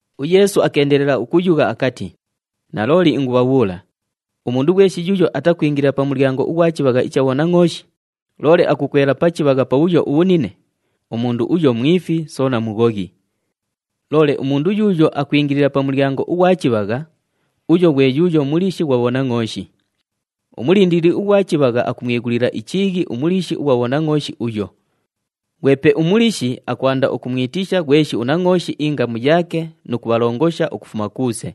UYeesu akeendelela ukuyugha akati, “Nalooli ingubhabhuula, umundu ghweshi yuuyo atakwingilila pa mulyango ughwa chibhagha icha bhonangʼooshi, loole akukwela pa chibhagha pabhuyo ubhunine, umundu uyo mwifi soona mughoghi. Loole umundu yuuyo akwingilila pa mulyango ughwa chibhagha, uyo ghwe yuuyo muliishi ghwa bhonangʼooshi. Umulindilili ughwa chibhagha akumwighulila ichiighi umuliishi ughwa bhonangʼooshi uyo. Ghwepe umuliishi akwanda ukumwitisha ghweshi unangʼooshi ingamu yaake nu kubhalongosha ukufuma kuuse.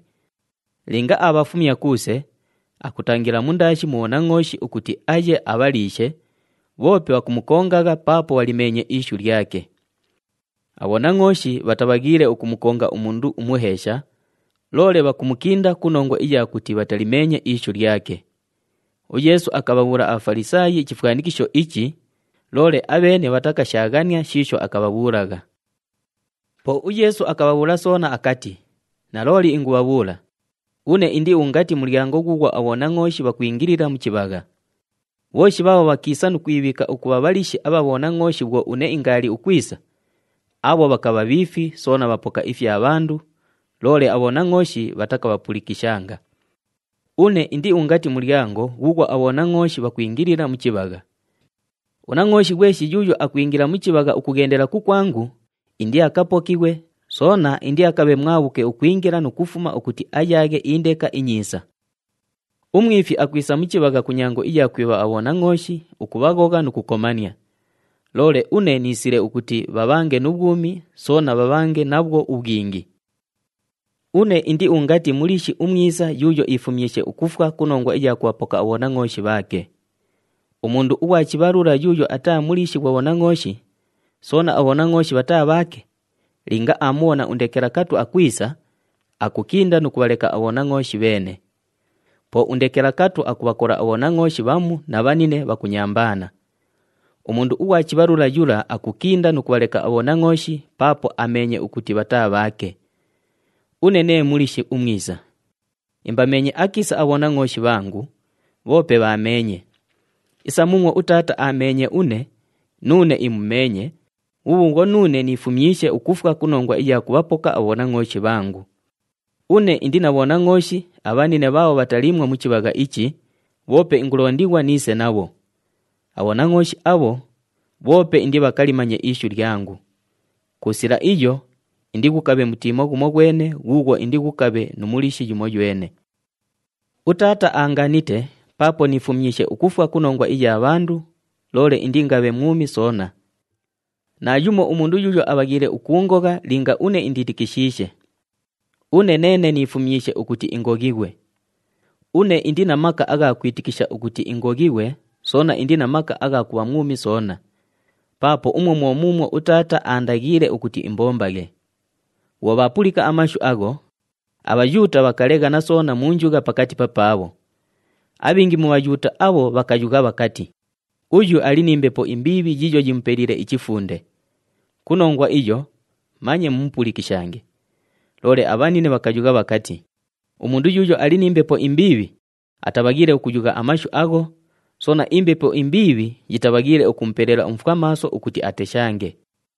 Linga aabhafumya kuuse, akutangila mundaashi mu bhonangʼooshi ukuti aye abhaliishe, bhoope bhakumukongagha paapo bhalimeenye ishu lyake. Abhonangʼooshi bhatabhaghiile ukumukonga umundu umuheesha, loole bhakumukinda ku nongwa iya kuti bhatalimeenye ishu lyake.” UYeesu akabhabhuula aBhafalisaayi ichifwanikisho ichi, loole abheene bhatakashaaghania shiisho akabhabhuulagha. Po uYeesu akabhabhuula soona akati, “Nalooli ingubhabhuula, une indi ungati mulyango ghuughwo abhonangʼooshi bhakwingilila mu chibhagha. Bhooshi bhaabho bhakiisa nu kwibhiika ukubha bhaliishi abha bhonangʼooshi bhwo une ingaali ukwisa, abho bhakabha bhiifi soona bhapoka ifya bhandu, loole abhonangʼooshi bhatakabhapulikishanga. Une indi ungati mulyango ghuughwo abhonangʼooshi bhakwingilila mu chibhagha. Unangʼooshi ghweshi yuuyo akwingila mu chibhagha ukughendela kukwangu, indiakapokighwe, soona indiakabhe mwabhuke ukwingila nu kufuma ukuti ayaaghe indeka inyiisa. Umwifi akwisa mu chibhagha ku nyango iya kwibha abhonangʼooshi, ukubhaghogha nu kukomania. Loole une niisile ukuti bhabhange nu bhwumi, soona bhabhange nabhwo ubhwingi. “Une indi ungati muliishi umwisa yuuyo iifumyishe ukufwa ku nongwa iya kubhapoka abhonangʼooshi bhaake. Umundu ughwa chibhalula yuuyo ataa muliishi ghwa bhonangʼooshi, soona abhonangʼooshi bhataa bhaake, linga aamubhona undekelakatu akwisa, akukinda nu kubhaleka abhonangʼooshi bheene. Po undekelakatu akubhakola abhonangʼooshi bhamu na bhanine bhakunyambaana. Umundu ughwa chibhalula yula akukinda nu kubhaleka abhonangʼooshi paapo ameenye ukuti bhataa bhaake. Une nee muliishi umwisa. Imbameenye akiisa abhonangʼooshi bhangu, bhoope bhaameenye. Isa muumwo uTaata aameenye une, nuune imumeenye, bhubhuubhwo nuune niifumyishe ukufwa ku nongwa iya kubhapoka abhonangʼooshi bhangu. Une indi na bhonangʼooshi abhanine bhaabho bhataliimwo mu chibhagha ichi, bhoope ingulondighwa niise nabho. Abhonangʼooshi abho, bhoope indibhakalimanye ishu lyangu. Ku sila iyo, indighukabhe mutiimo ghumoghwene ghuughwo indighukabhe nu muliishi yumoywene. “UTaata aanganite paapo niifumyishe ukufwa ku nongwa iya bhandu, loole indiingabhe mwumi soona. Naayumo umundu yuuyo abhaghiile ukuungogha linga une indiitikishiishe. Une neene niifumyishe ukuti ingoghighwe. Une indi na maka agha kwitikisha ukuti ingoghighwe soona indi na maka agha kubha mwumi soona. Paapo umwo mwo muumwo uTaata aandaghiile ukuti imbombaghe.” Bhwo bhaapulika amashu agho, aBhayuuta bhakaleghana soona mu njugha pakati papaabho. Abhingi mu Bhayuuta abho bhakayugha bhakati, “Uyu ali ni mbepo imbiibhi yiiyo yimupeliile ichifunde. Ku nongwa iyo, manye mumupulikishange.” Loole abhanine bhakayugha bhakati, “Umundu yuuyo ali ni mbepo imbiibhi atabhaghiile ukuyugha amashu agho, soona imbepo imbiibhi yitabhaghiile ukumupela umufwamaaso ukuti ateshange!”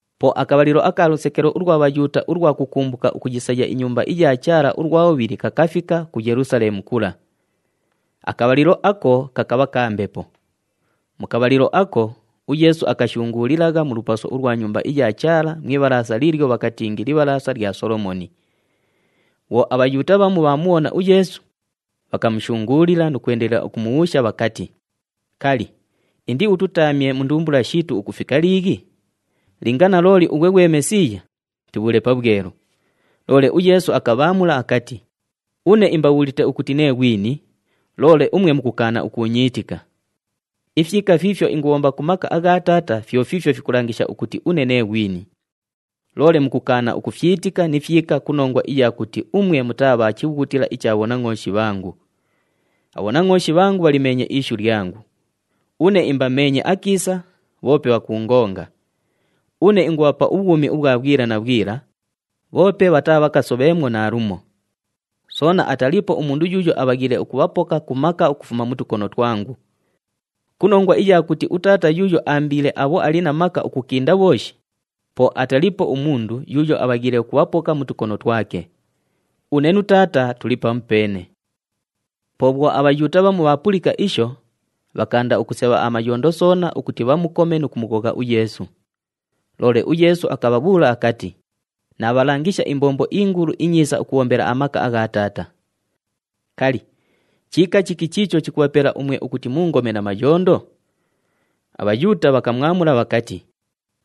Po akabhalilo aka lusekelo ulwa Bhayuuta ulwa kukumbuka ukuyisaya iNyumba iya Chaala ulwa bhubhili kakafika ku Yelusaleemu kula. Akabhalilo ako kakabha ka mbepo. Mu kabhalilo ako, uYeesu akashunguulilagha mu lupaso ulwa Nyumba iya Chaala mu ibhalaasa liilyo bhakatingi Libhalaasa lya Solomooni. Bhwo aBhayuuta bhamu bhaamubhona uYeesu, bhakamushunguulila nu kwendelela ukumubhuusha bhakati, “Kali, indiututamye mu ndumbula shiitu ukufika liighi? Linga nalooli ughwe ghwe Mesiiya, tubhuule pabhwelu.” Loole uYeesu akabhaamula akati, “Une imbabhuulite ukuti nee ghwini, loole umwe mukukaana ukuunyiitika. Ifyika fiifyo ingubhomba ku maka agha Taata fyo fiifyo fikulangisha ukuti une nee ghwini. Loole mukukaana ukufyitika ni fyika ku nongwa iya kuti umwe mutaa bha chibhughutila icha bhonangʼooshi bhangu. Abhonangʼooshi bhangu bhalimeenye ishu lyangu. Une imbameenye akiisa, bhoope bhakuungonga. Une ingubhapa ubhwumi ubhwa bhwila na bhwila, bhoope bhataabhakasobheemwo naalumo. Soona ataliipo umundu yuuyo abhaghiile ukubhapoka ku maka ukufuma mu tukono twangu. Ku nongwa iya kuti uTaata yuuyo aambiile abho ali na maka ukukinda bhooshi, po ataliipo umundu yuuyo abhaghiile ukubhapoka mu tukono twake. Une nu Taata tuli pamupeene.” Po bhwo aBhayuuta bhamu bhaapulika isho, bhakaanda ukusebha amayondo soona ukuti bhamukome nu kumughogha uYeesu. Loole uYeesu akabhabhuula akati, “Naabhalangisha imbombo ingulu inyiisa ukubhombela amaka agha Taata. Kali, chiika chiki chiicho chikubhapela umwe ukuti muungome na mayondo?” ABhayuuta bhakamwamula bhakati,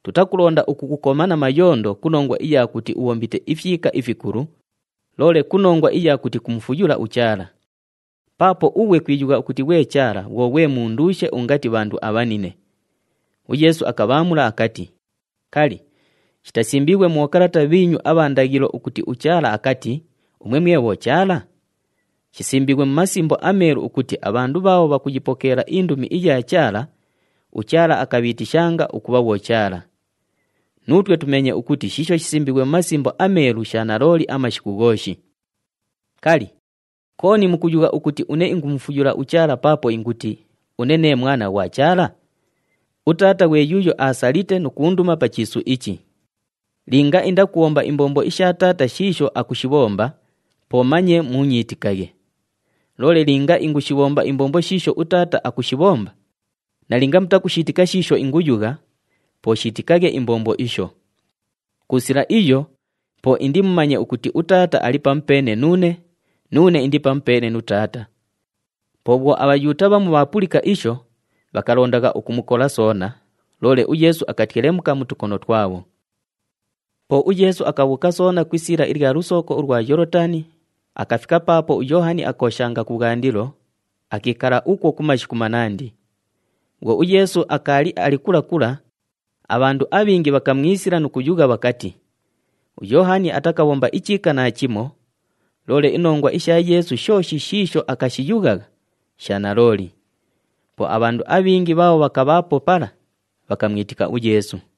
“Tutakulonda ukukukoma na mayondo ku nongwa iya kuti ubhombite ifyika ifikulu, loole ku nongwa iya kuti kumufuyula uChaala. Paapo ughwe kwiyugha ukuti ghwe Chaala bhwo ghwe munduushe ungati bhandu abhanine!” UYeesu akabhaamula akati, “Kali, shitasimbiighwe mu bhokalata bhiinyu abha ndaghilo ukuti uChaala akati, ‘Umwe mwe bhochaala’? Shisimbiighwe mu Masimbo aMeelu ukuti abhandu bhaabho bhakayipokeela indumi iya Chaala, uChaala akabhiitishanga ukubha bhochaala. Nuutwe tumeenye ukuti shiisho shisimbiighwe mu Masimbo aMeelu sha nalooli amashiku ghooshi. Kali, kooni mukuyugha ukuti une ingumufuyula uChaala paapo inguti, ‘Une nee Mwana ghwa Chaala’? UTaata ghwe yuuyo aasalite nu kuunduma pa chiisu ichi. Linga indakubhomba imbombo isha Taata shiisho akushibhomba, po manye muunyiitikaghe. Loole linga ingushibhomba imbombo shiisho uTaata akushibhomba, nalinga mutakushiitika shiisho inguyugha, po shiitikaghe imbombo isho. Ku sila iyo, po indimumanye ukuti uTaata ali pamupeene nuune, nuune indi pamupeene nu Taata.” Po bhwo aBhayuuta bhamu bhaapulika isho, bhakalondagha ukumukola soona, loole uYeesu akatyelemuka mu tukono twabho. Po uYeesu akabhuuka soona ku isiila ilya lusooko ulwa Yoolotani, akafika paapo uYoohani akooshanga kubhwandilo, akiikala ukwo ku mashiku manandi. Bhwo uYeesu akaali ali kula kula, abhandu abhingi bhakamwisila nu kuyugha bhakati, “UYoohani atakabhomba ichiika naachimo, loole inongwa isha Yeesu shooshi shiisho akashiyughagha, sha nalooli.” Po abhandu abhingi bhaabho bhakabhaapo pala bhakamwitika uYeesu.